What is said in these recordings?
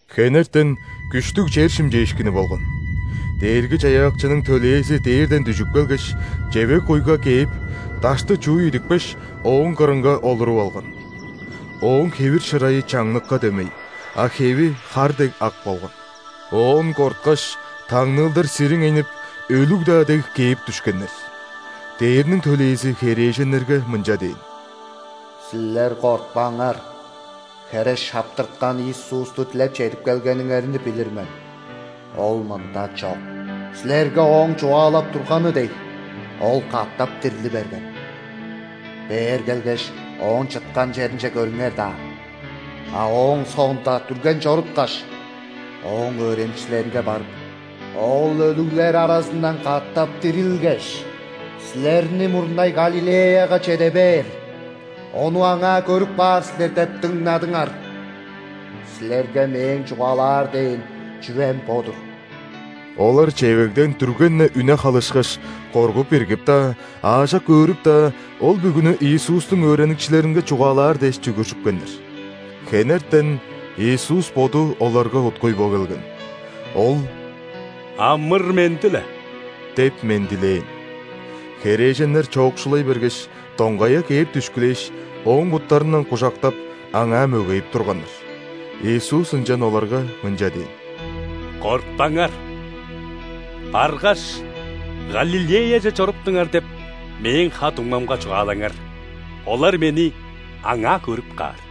Хенертен күштүг чер шимчээшкини болган: Дээрги-Чаяакчының төлээзи дээрден дүжүп келгеш, чевег-куйга кээп, дашты чууй идипкеш, ооң кырынга олуруп алган. Ооң хевир-шырайы чаңныкка дөмей, а хеви хар дег ак болган. Оон корткаш, таңныылдар сириңейнип, өлүг-даа дег кээп дүшкеннер. Дээрниң төлээзи херээженнерге мынча дээн: «Силер кортпаңар. Хере шаптырткан Иисусту дилеп чедип келгениңерни билир мен. Ол мында чок. Силерге Ооң чугаалап турганы дег, Ол катап дирли берген. Бээр келгеш, Ооң чыткан черинче көрүңер даан. А ооң соонда дүрген чоруткаш, Ооң өөреникчилеринге барып: „Ол өлүглер аразындан катап дирилгеш, силерни мурнай Галилеяга чеде бээр. Ону аңаа көрүп каар силер“ – деп дыңнадыңар. Силерге Мээң чугаалаар дээн чүвем бо-дур». Олар чевегден дүрген-не үне халышкаш, коргуп-иргип-даа, аажок өөрүп-даа, ол бүгүнү Иисустуң өөреникчилеринге чугаалаар дээш чүгүржүпкеннер. Хенертен Иисус Боду оларга уткуй бо келген. Ол: «Амыр-менди-ле!» – деп мендилээн. Херээженнер чоокшулай бергеш, доңгая кээп дүшкүлээш, Ооң буттарындан кужактап, Аңаа мөгейип турганнар. Иисус ынчан оларга мынча дээн: «Кортпаңар! Баргаш, „Галилеяже чоруптуңар“ деп Мээң ха-дуңмамга чугаалаңар. Олар Мени аңаа көрүп каар».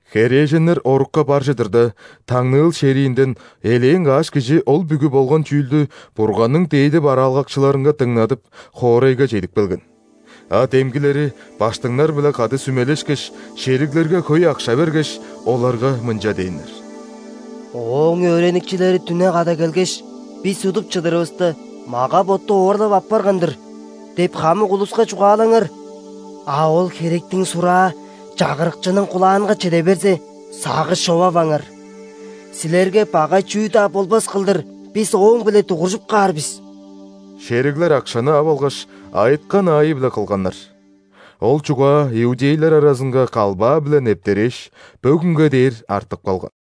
Херээженнер орукка бар чыдырда, таңныыл шериинден элээн каш кижи ол бүгү болган чүүлдү Бурганның дээди бараалгакчыларынга дыңнадып, хоорайга чедип келген. А демгилери ·баштыңнар-биле кады сүмелешкеш, шериглерге хөй акша бергеш, оларга мынча дээннер: «„Ооң өөреникчилери дүне када келгеш, бис удуп чыдырывыста, мага-ботту оорлап аппарган-дыр“ – деп хамык улуска чугаалаңар. А ол херектиң сураа чагырыкчының кулаанга чеде берзе, сагыш човаваңар: силерге багай чүү-даа болбас кылдыр бис ооң-б��ле дугуржуп каар бис». Шериглер акшаны ап алгаш, айыткан аайы-биле кылганнар. Ол чугаа иудейлер аразынга калбаа-биле нептерээш, бөгүнге дээр артып калган.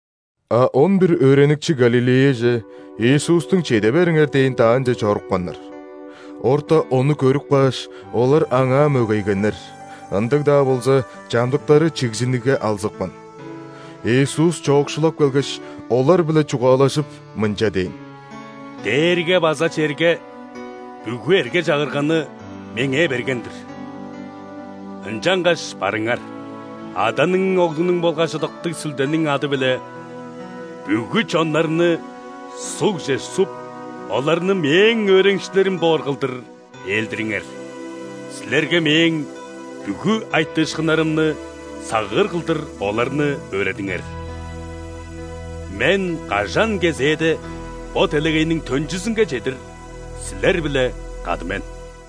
А он бир өөреникчи Галилеяже, Иисустуң чеде бериңер дээн даанче чорупканнар. Орта Ону көрүп кааш, олар Аңаа мөгейгеннер, ындыг-даа болза, чамдыктары чигзинигге алзыпкан. Иисус чоокшулап келгеш, олар-биле чугаалажып, мынча дээн: «Дээрге база черге бүгү эрге-чагырганы Меңээ берген-дир. Ынчангаш барыңар, Аданың, Оглунуң болгаш Ыдыктыг Сүлдениң ады-биле бүгү чоннарны ·сугже суп, оларны Мээң өөреникчилерим боор кылдыр ээлдириңер. Силерге Мээң бүгү айтыышкыннарымны сагыыр кылдыр оларны өөредиңер. Мен кажан кезээде, бо делегейниң төнчүзүнге чедир силер-биле кады мен».